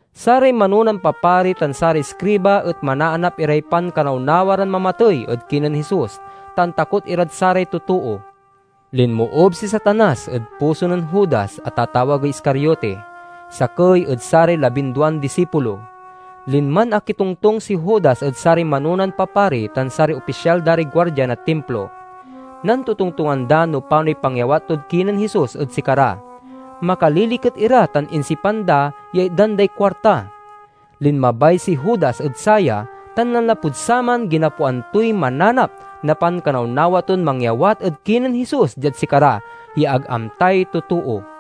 Saray manonan papari tan saray iskriba et manaanap iray pankanawnawa ran mamatey ed kinen Jesus, ta antakot irad saray totoo. Linmoob si Satanas ed puso nen Judas a tatawagey Iscariote, sakey ed saray labinduan disipulo. Linman akitongtong si Judas ed saray manonan papari tan saray opisyal da ray guardia na Timplo. Nantotongtongan da no panoy pangyawat tod kinen Jesus ed sikara. Makaliliket ira tan insipan da ya itdan day kuarta. Linmabay si Judas ed saya, tan nanlapud saman ginapoan toy mananap na pankanawnawa ton mangyawat ed kinen Jesus diad sikara, ya ag amtay totoo.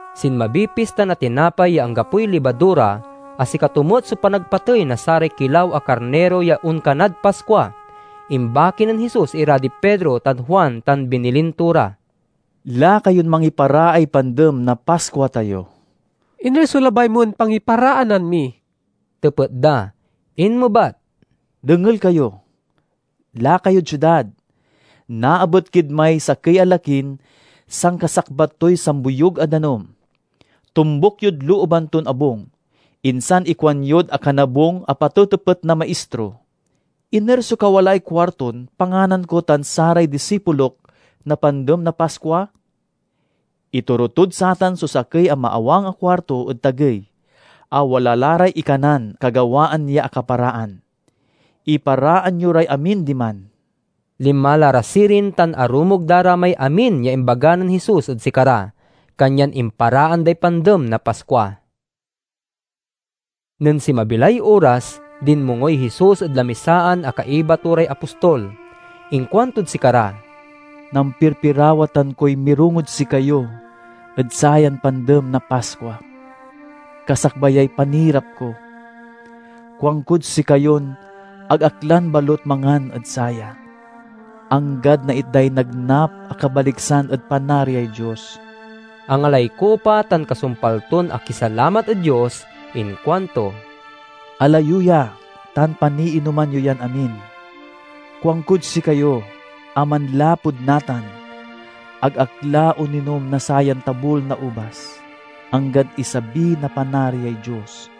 Sinmabiy Pista na Tinapay ya Anggapoy Libadura, a sikato met so panagpatey na saray kilaw a karniro ya onkanad Paskua. Imbaki nen Jesus ira di Pedro tan Juan tan binilin to ra, "Laka yon mangiparaay Pandem na Paskua tayo." "Iner so labay mon pangiparaanan mi?" tepet da. Inmebat, "Dengel kayo! Laka yod siudad. Naabet kid may sakey a lakin sankasakbat toy samboyug a danum. Tombuk yod looban ton abung. Insan ikuanyod akanabung a patetepet na Maistro: 'Iner so kawalaay kuarton panganan ko tan saray disipulok na Pandem na Paskua?' Itoro tod satan so sakey a maawang a kuarto ed tagey, a wala la ray ikanan kagawaan ya akaparaan. Iparaan yo ray amin diman." Linma la ra sirin tan arumog da ra may amin ya imbaga nen Jesus ed sikara. Kanyan imparaan day Pandem na Paskua. Nen sinmabi lay oras, dinmongoy Jesus ed lamisaan a kaiba to ray apostol. Inkuantod sikara, "Nampirpirawatan koy mirongod sikayo ed sayan Pandem na Paskua, kasakbayay panirap ko! Kuankod sikayon ag ak lan balut mangan ed saya, anggad naitday nagnap a kabaliksan ed Panariay Dios." Angalay kupa tan kasumpal ton akisalamat ed Dios inkuanto, "Ala yo ya tan paniinoman yon amin. Kuankod sikayo a manlapud natan, ag ak la oninom na sayan tabul na ubas, anggad isabi na Panariay Dios."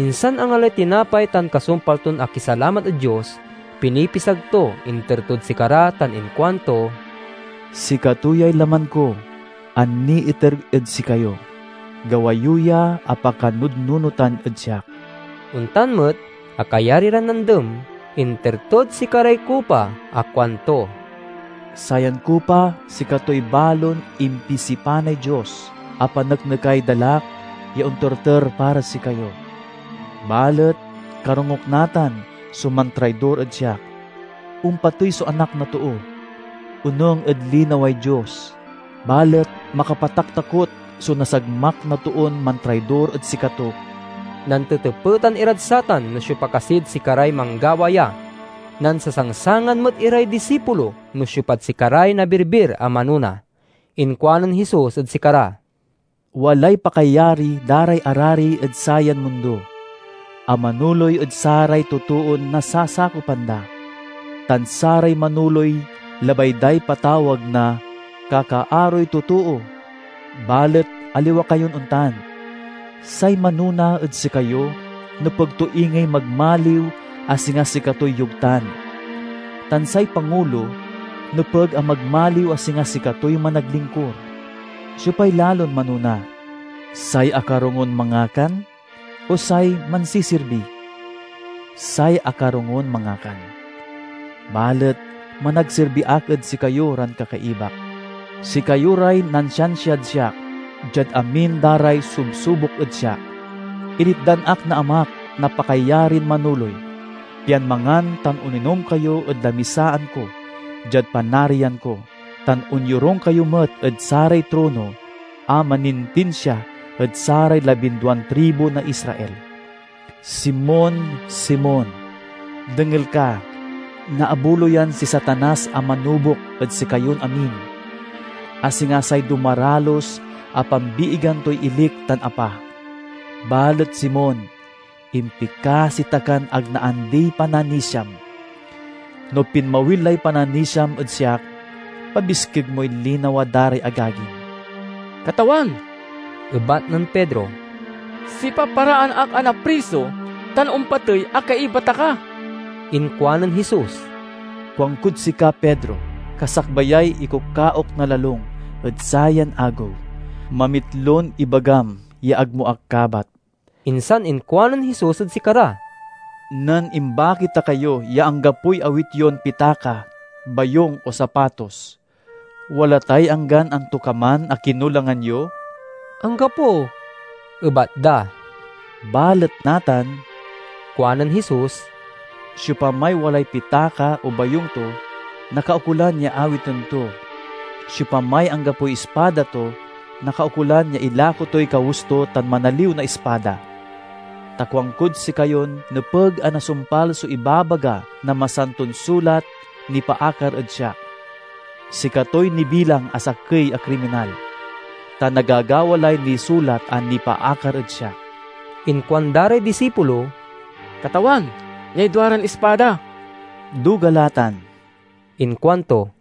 Insan angalay tinapay tan kasumpal ton akisalamat ed Dios, pinipisag to, inter tod sikara tan inkuanto, "Sikato yay laman ko a niiter ed sikayo. Gawa yo ya a pakanudnunotan ed siak." Ontan met a kayari ran nandem, inter tod sikaray kupa a kuanto, "Sayan kupa sikatoy balon impisipanay Dios a paneknekay dalak ya onterter para sikayo. "Balet karongok natan so mantraidor ed siak! Ompatey so Anak na Too, onung ed linaway Dios. Balet makapataktakot so nasagmak na toon mantraidor ed sikato!" Nantetepetan irad satan no siopa kasid sikaray manggawa ya. Nansasangsangan met iray disipulo no siopad sikaray nabirbir a manona. Inkuanen Jesus ed sikara, "Walay pakayari da ray arari ed sayan mundo a manoley ed saray totoon nasasakopan da; tan saray manoley labay day patawag na 'Kakaaroy Totoo.' Balet aliwa kayon ontan. Say manona ed sikayo nepeg to ingey magmaliw a singa sikatoy yogtan; tan say pangulo nepeg a magmaliw a singa sikatoy managlingkur. Siopay lalon manona: say akarongon mangakan, o say mansisirbi? Say akarongon mangakan. Balet managsirbi ak ed sikayo ran kakaibak. "Sikayo ray nansiansiad siak diad amin da ray subsubok ed siak. Initdan ak na Amak na pakayarin manoley, pian mangan tan oninom kayo ed lamisaan ko diad Panarian ko, tan onyorung kayo met ed saray trono a manintinsia ed saray labinduan tribu na Israel." "Simon, Simon, dengel ka! Naabuloyan si Satanas a manubok ed sikayon amin, a singa say dumaralus a pambiigan toy ilik tan apa. Balet Simon, impikasi ta kan ag naandiy pananisiam. No pinmawil lay pananisiam ed siak, pabiskeg moy linawa da ray agagim." "Katawan," ebat nen Pedro, "sipaparaan ak a napriso tan ompatey a kaiba ta ka!" Inkuanen Jesus, "Kuankod sika, Pedro, kasakbayay ikukaok na lalung ed sayan agew, mamitlon ibagam ya ag mo ak kabat." Insan inkuanen Jesus ed sikara, "Nen imbaki ta kayo ya anggapoy awit yon pitaka, bayung, o sapatos, wala tay anggan antokaman a kinulangan yo?" "Anggapo," ebat da. "Balet natan," kuanen Jesus, "siopamay walay pitaka o bayung to, nakaukolan ya awiten to. Siopamay anggapoy ispada to nakaukolan ya ilako toy kawes to tan manaliw na ispada. Ta kuankod sikayon nepeg a nasumpal so ibabaga na Masanton Sulat nipaakar ed siak, 'Sikatoy nibilang a sakey a kriminal.' Ta nagagawa lay nisulat a nipaakar ed siak." Inkuanda ray disipulo, "Katawan, niay duaran ispada!" "Duga la tan!" inkuanto.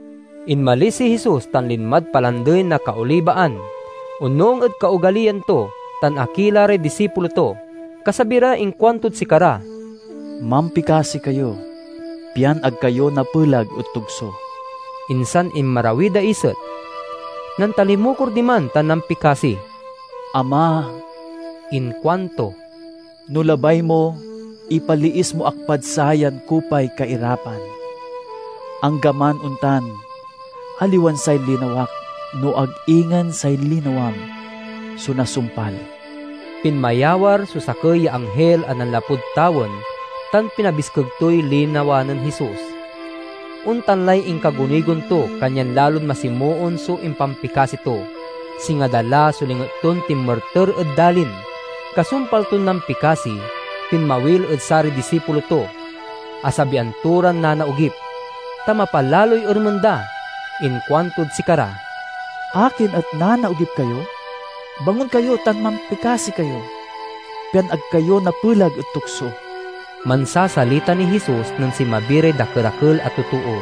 Inmalis si Jesus tan linmad Palandey na Kaolibaan, onung ed kaogaliyan to; tan akila ray disipulo to. Kasabi ra inkuantod sikara, "Mampikasi kayo, pian ag kayo napelag ed tukso." Insan inmarawiy daiset. Nantalimukor diman tan nampikasi. "Ama," inkuanto, "no labay mo, ipaliis mo ak pad sayan kupay kairapan. Anggaman ontan, aliwan say linawak, no ag ingen say linawam, so nasumpal." Pinmayawar so sakey ya anghil a nanlapud tawen, tan pinabiskeg toy linawa nen Jesus. Ontan lay inkagunigon to, kanyan lalon masimoon so impampikasi to. Singa dala so linget ton tinmerter ed dalin. Kasumpal ton nampikasi, pinmawil ed saray disipulo to. Asabian to ran nanaogip, ta mapalaloy ermen da. Inkuantod sikara, "Akin et nanaogip kayo? Bangon kayo tan mampikasi kayo, pian ag kayo napelag ed tukso." Mansasalita niy Jesus nen sinmabi ray dakerakel a totoo.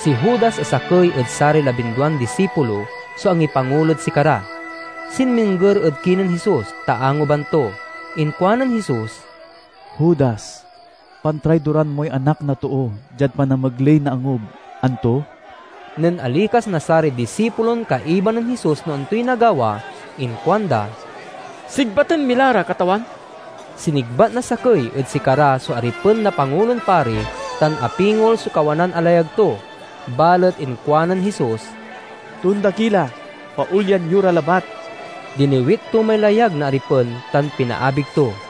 Si Judas a sakey ed saray labinduan disipulo so angipangulod sikara. Sinmingger ed kinen Jesus, ta anguban to. Inkuanen Jesus, "Judas, pantraidoran moy Anak na Too diad panamegley na angub, anto?" Nen alikas na saray disipulon kaiba nen Jesus no antoy nagawa inkuanda, "Sigbaten mi la ra, Katawan?" Sinigbat na sakey ed sikara so aripen na Pangulon Pari, tan apingol so kawanan a layag to. Balet inkuanen Jesus, "Tonda ki la! Paolyan yo ra labat!" Diniwit to may layag na aripen, tan pinaabig to.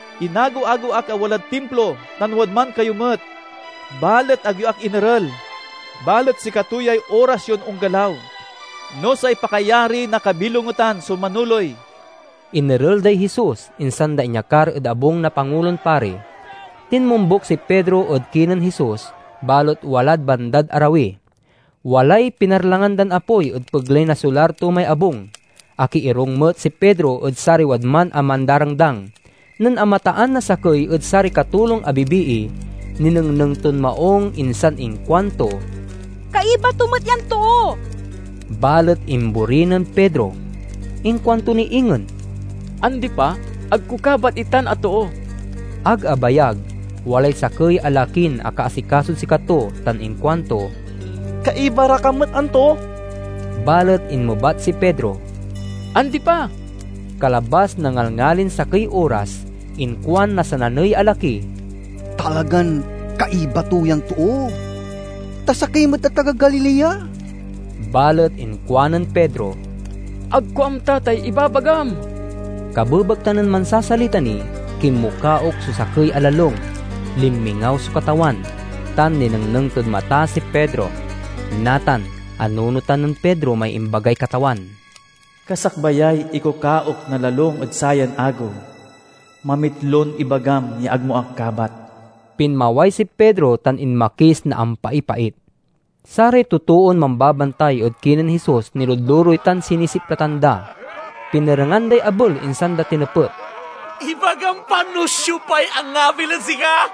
Inagew-agew ak a walad Timplo tan wadman kayo met, balet ag yo ak inerel. Balet sikato yay oras yon onggalaw, no say pakayari na kabilongetan so manoley." Inerel day Jesus, insan da inyakar ed abung na Pangulon Pari. Tinmombuk si Pedro ed kinen Jesus, balet walad bandad arawi. Walay pinarlangan dan apoy ed pegley na solar to may abung. Akiirung met si Pedro ed saray wadman a mandarangdang. Nen amataan na sakey ed saray katulong a bibii, ninengneng ton maung, insan inkuanto, "Kaiba to met yan too!" Balet imbori nen Pedro. Inkuanto ni ingen, "Andi pa, ag ko kabat itan a too!" Ag abayag, walay sakey a lakin akaasikasod sikato tan inkuanto, "Kaiba ra ka met, anto?" Balet inmebat si Pedro, "Andi pa!" Kalabas na ngalngalin sakey oras, inkuan na sananey a laki, "Talagan kaiba to yan too, ta sakey met a taga Galilea!" Balet inkuanen Pedro, "Ag ko amta tay ibabagam!" Kabebekta nen mansasalita ni, kinmukaok so sakey a lalung. Linmingaw so Katawan, tan ninengneng tod mata si Pedro. Natan anunotan nen Pedro may imbagay Katawan, "Kasakbayay ikukaok na lalung ed sayan agew, mamitlon ibagam ya ag mo ak kabat." Pinmaway si Pedro tan inmakis na ampaipait. Saray totoon mambabantay ed kinen Jesus niludlurey tan sinisiplatan da. Pinerengan day abel insan da tinepet, "Ibagam pa no siopay angabil ed sika!"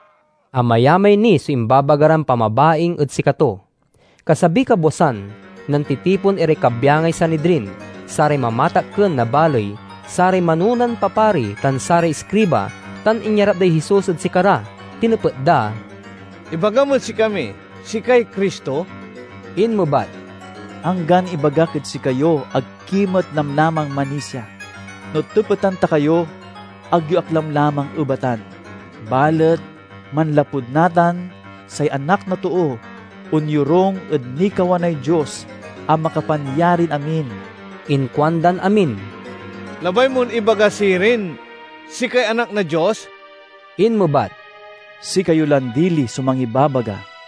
Amayamay ni so imbabaga ran pamabaing ed sikato." Kasabiy kabwasan, nantitipon iray kabyangay Sanidrin: saray mamatakken na baley, saray manonan papari, tan saray iskriba, tan inyarap day Jesus ed sikara. Tinepet da, "Ibagam ed sikami sikay Cristo?" Inmebat, "Anggan ibagak ed sikayo ag ki met lamlamang manisia. No tepetan ta kayo, ag yo ak lamlamang ebatan. Balet, manlapud natan, say Anak na Too onyorung ed nikawanay Dios a Makapanyarin-amin." Inkuandan amin, "Labay mon ibaga, sirin, sikay Anak na Dios?" Inmebat, "Sikayo lan dili so mangibabaga."